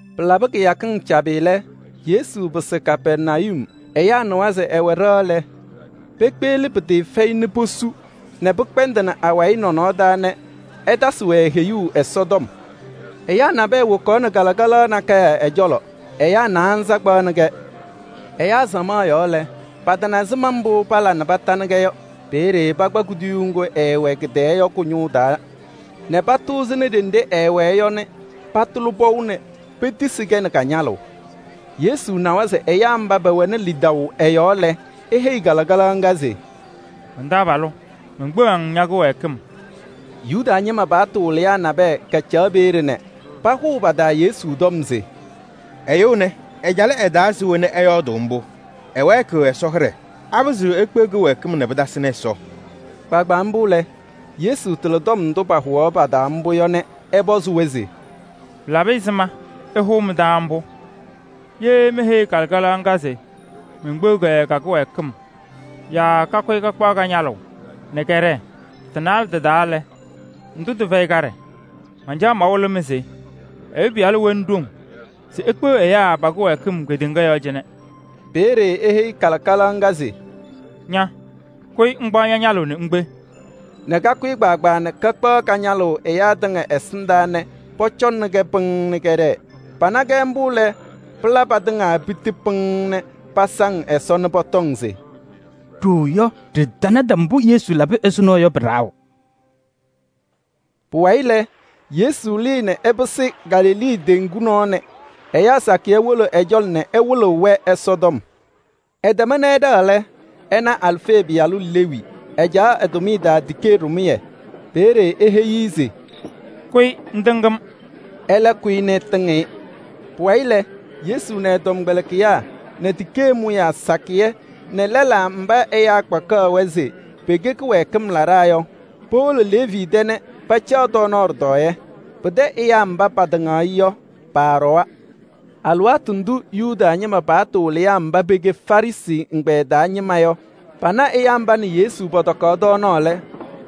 Pɩlabɩ kɩyakɩŋ cabɩ lɛ, Yesu pɩsɩ Kapɛrnayum. Ɛyaa nɩwa se ɛwɛ ɖɩɣa lɛ, pekpeɣli pɩtɩɩfɛyɩ nɛ posu nɛ pɩkpɛndɩnɩ awayɩ nɔnɔɔ taa nɛ ɛtasɩ-wɛ heyuu Ɛsɔtɔm. Ɛyaa nabɛyɛ wokaɣnɩ kalɩkalaɣ nakɛyɛ ɛ-cɔlɔ. Ɛyaa naanza kpaɣnɩ-kɛ. Ɛyaa samaɣ yɔɔ lɛ, patana ɛzɩma mbʋ pala nɛ patanɩ-kɛ yɔ. Peeye pakpa kuduyuu ŋgʋ ɛɛwɛ kɩ-tɛɛ yɔ kʋ-ñʋʋ taa nɛ patʋʋzɩnɩ ɖenɖe ɛɛwɛɛ yɔ nɛ patʋlɩ pɔʋ nɛ petisi-kɛ nɛ ka-ñalʋʋ. Yesu nawa se ɛyaa mba pɛwɛnɩ lidaʋ ɛ-yɔɔ lɛ, eheyi kalɩkalaɣ ŋga se: “Man-taabalʋ! Menkpeɣ-ŋ ña-kɩwɛɛkɩm.” Yuda ñɩma paɣtʋ wɩlɩyaa nabɛyɛ kacaɣ peeye nɛ pahʋʋ pa-taa Yesu tɔm se: “Ɛyʋ ɛnɛ ɛcalɩ ɛ-taa se we nɛ ɛyɔɔdʋʋ mbʋ? Ɛwɛɛkɩɣ Ɛsɔ hɩɖɛ! Apɩzɩɣ ekpeɣ kɩwɛɛkɩm nɛ pɩtasɩnɩ Ɛsɔ?” Kpaagbaa mbʋ lɛ, Yesu tɩlɩ tɔm ndʋ pahʋwaɣ pa-taa mbʋ yɔ nɛ ɛpɔzɩ-wɛ se: “Pɩlabɩ ɛzɩma ɩhʋʋ mɩ-taa mbʋ? Ye meheyi kalɩkalaɣ ŋga se menkpeɣ-kɛ ka-kɩwɛɛkɩm yaa kakʋyɩ kakpaɣ ka-ñalʋʋ nɛ kɛɖɛɛ, tɩ-naalɛ tɩ-taa lɛ, ndʋ tɩfɛyɩ kaɖɛ? Mancaɣ mawɩlɩ-mɩ se Ɛyʋ Pɩyalʋ wɛnɩ ɖoŋ se ekpeɣ ɛyaa pa-kɩwɛɛkɩm kedeŋa yɔɔ cɩnɛ.” Peeye eheyi kalɩkalaɣ ŋga se: “Ña! Kʋyɩ ŋkpaɣ ña-ñalʋʋ nɛ ŋkpe” nɛ kakʋyɩ kpaagbaa nɛ kakpaɣ ka-ñalʋʋ ɛyaa tɩŋa ɛsɩndaa nɛ pɔcɔnɩ-kɛ pɩŋŋ nɛ kɛɖɛɛ. Pana-kɛ mbʋ lɛ, pɩla patɩŋa piti pɩŋŋ nɛ pasaŋ Ɛsɔ nɛ pɔtɔŋ se: “Ɖooo yɔ, ɖɩtanata mbʋ Yesu labɩ ɛzʋnɔ yɔ pɩ-lɛzʋʋ.” Pʋwayɩ lɛ, Yesu lɩɩ nɛ ɛpɩsɩ Galilee teŋgu nɔɔ nɛ ɛyaa sakɩyɛ wolo ɛ-cɔlɔ nɛ ɛwɩlɩ-wɛ Ɛsɔtɔm. Ɛtɛma nɛ ɛɖɛɣ lɛ, ɛna Alfee pɩyalʋ Leevi, ɛcaɣ ɛ-tʋmɩyɛ taa tikee ɖɩmʋyɛ. Peeye eheyi-i se: “Kʋyɩ ŋtɩŋ-m!” Ɛlɛ kʋyɩ nɛ ɛtɩŋ-ɩ. Pʋwayɩ lɛ, Yesu nɛ ɛ-tɔmkpɛlɩkɩyaa nɛ tikee mʋyaa sakɩyɛ nɛ lɛlaa mba ɛyaa kpakaɣ-wɛ se pɛkɛ kɩwɛɛkɩm laɖaa yɔ, powolo Leevi tɛ nɛ pacaɣ tɔɔnaɣ ɖɩtɔɔyɛ. Pɩtɛ ɛyaa mba patɩŋaɣ-ɩ yɔ, paaɖɔwa. Alɩwaatʋ ndʋ Yuda ñɩma paɣtʋ wɩlɩyaa mba pɛkɛ Farɩsɩ ɛgbɛyɛ taa ñɩma yɔ pana ɛyaa mba nɛ Yesu pɔtɔkaɣ tɔɔnaɣ lɛ,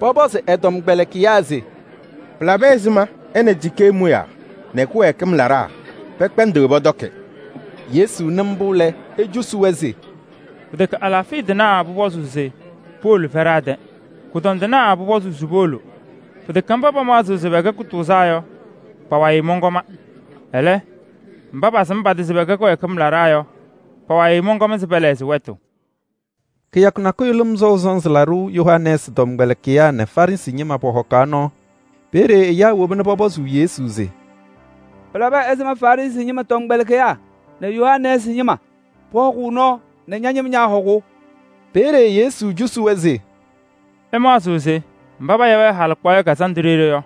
pɔpɔzɩ ɛ-tɔmkpɛlɩkɩyaa se: “Pɩlabɩ ɛzɩma ɛ nɛ tikee mʋyaa nɛ kɩwɛɛkɩm laɖaa pɛkpɛndɩɣ pɔtɔkɩ?” Yesu nɩ mbʋ lɛ, ecosi-wɛ se: “Pɩtɛkɛ alaafɩya tɩnaa pʋpɔzʋʋ se powolo fɛɖaa tɛ, kʋdɔndɩnaa pʋpɔzʋʋ se powolo. Pɩtɛkɛ mba pamaɣzɩɣ se pɛkɛ kʋtʋʋzaa yɔ, pa-wayɩ mɔnkɔma. Ɛlɛ, mba pasɩm pa-tɩ se pɛkɛ kɩwɛɛkɩm laɖaa yɔ, pa-wayɩ mɔnkɔm se pɛlɛɣzɩ wɛtʋ.” Kɩyakʋ nakʋyʋ Lɩm Sɔʋ Sɔnzɩ Laɖʋ Yohanɛɛsɩ tɔmkpɛlɩkɩyaa nɛ Farɩsɩ ñɩma pɔhɔkaɣ nɔɔ Ɛsɔtɔm yɔɔ. Peeye ɛyaa woba nɛ pɔpɔzɩ Yesu se: “Pɩlabɩ ɛzɩma Farɩsɩ ñɩma tɔmkpɛlɩkɩyaa nɛ Yohanɛɛsɩ ñɩma pɔhɔkʋʋ nɔɔ nɛ ña-ñɩma ñaahɔkʋʋ?” Peeye Yesu cosi-wɛ se: “Ɩmaɣzɩɣ se mba payaɣ-wɛ halɩkpaɣyɛ kazandʋ ɖeɖe yɔ,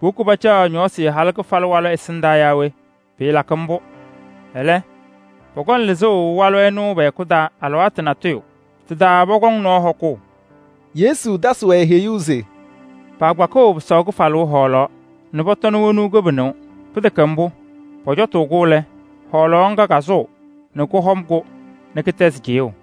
powoki pacaɣ ñɔɔsɩ halʋ kɩfalʋ walʋ ɛsɩndaa yaa we? Pɩɩlakɩ mbʋ. Ɛlɛ, pɔkɔŋ lɩzʋʋ walʋ ɛnʋ pɛ-hɛkʋ taa alɩwaatʋ natʋyʋ. Tɩ-taa pɔkɔŋ nɔɔ hɔkʋʋ.” Yesu tasɩ-wɛ heyuu se: “Paakpakɩɣ pɩsaʋ kɩfalʋʋ hɔɔlaɣ nɛ pɔtɔnɩ wonuu kɩbɩnʋʋ. Pɩtɛkɛ mbʋ, pɔcɔtʋʋ-kʋ lɛ, hɔɔlaɣ ŋga kasʋʋ nɛ kɔhɔm-kʋ nɛ kɩtɛzɩ cɩyʋʋ.”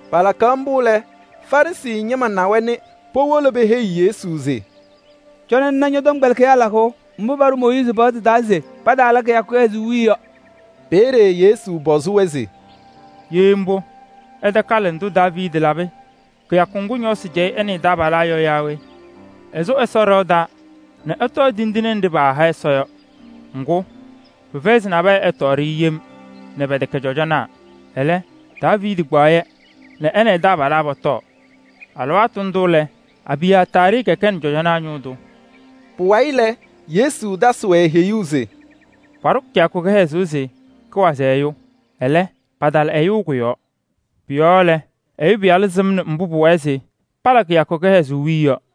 Palakaɣ mbʋ lɛ, Farɩsɩ ñɩma na-wɛ nɛ powolo peheyi Yesu se: “Cɔnɩ ŋna ñɔ-tɔmkpɛlɩkɩyaa lakʋʋ mbʋ paɖʋ Mooyiizi paɣtʋ taa se pataala kɩyakʋ kɩhɛzʋʋ wiye yɔ.” Peeye Yesu pɔzɩ-wɛ se: “Ye mbʋ, ɩtakalɩdɩ mbʋ Daaviidi labɩ kɩyakʋ ŋgʋ ñɔɔsɩ cɛyɩ ɛ nɛ ɛ-taabalaa yɔ yaa we? Ɛsʋ Ɛsɔ ɖɩɣa taa nɛ ɛtɔɔ tindine wena paaha Ɛsɔ yɔ. Ŋgʋ, pɩfɛyɩ se nabɛyɛ ɛtɔɔ-yɛ yem nɛ pɛtɛkɛ cɔjɔnaa. Ɛlɛ, Daaviidi kpaɣ-yɛ nɛ ɛ nɛ ɛ-taabalaa pɔtɔɔ. Alɩwaatʋ ndʋ lɛ, Abiyaataarɩ kɛkɛnɩ cɔjɔnaa ñʋʋ tʋ.” Pʋwayɩ lɛ, Yesu tasɩ-wɛ heyuu se: “Paɖʋ kɩyakʋ kɩhɛzʋʋ se pʋwazɩ ɛyʋ. Ɛlɛ, patala ɛyʋ kʋ-yɔɔ. Pʋ-yɔɔ lɛ, Ɛyʋ Pɩyalʋ sɩmnɩ mbʋ pʋwɛɛ se pala kɩyakʋ kɩhɛzʋʋ wiye yɔ.”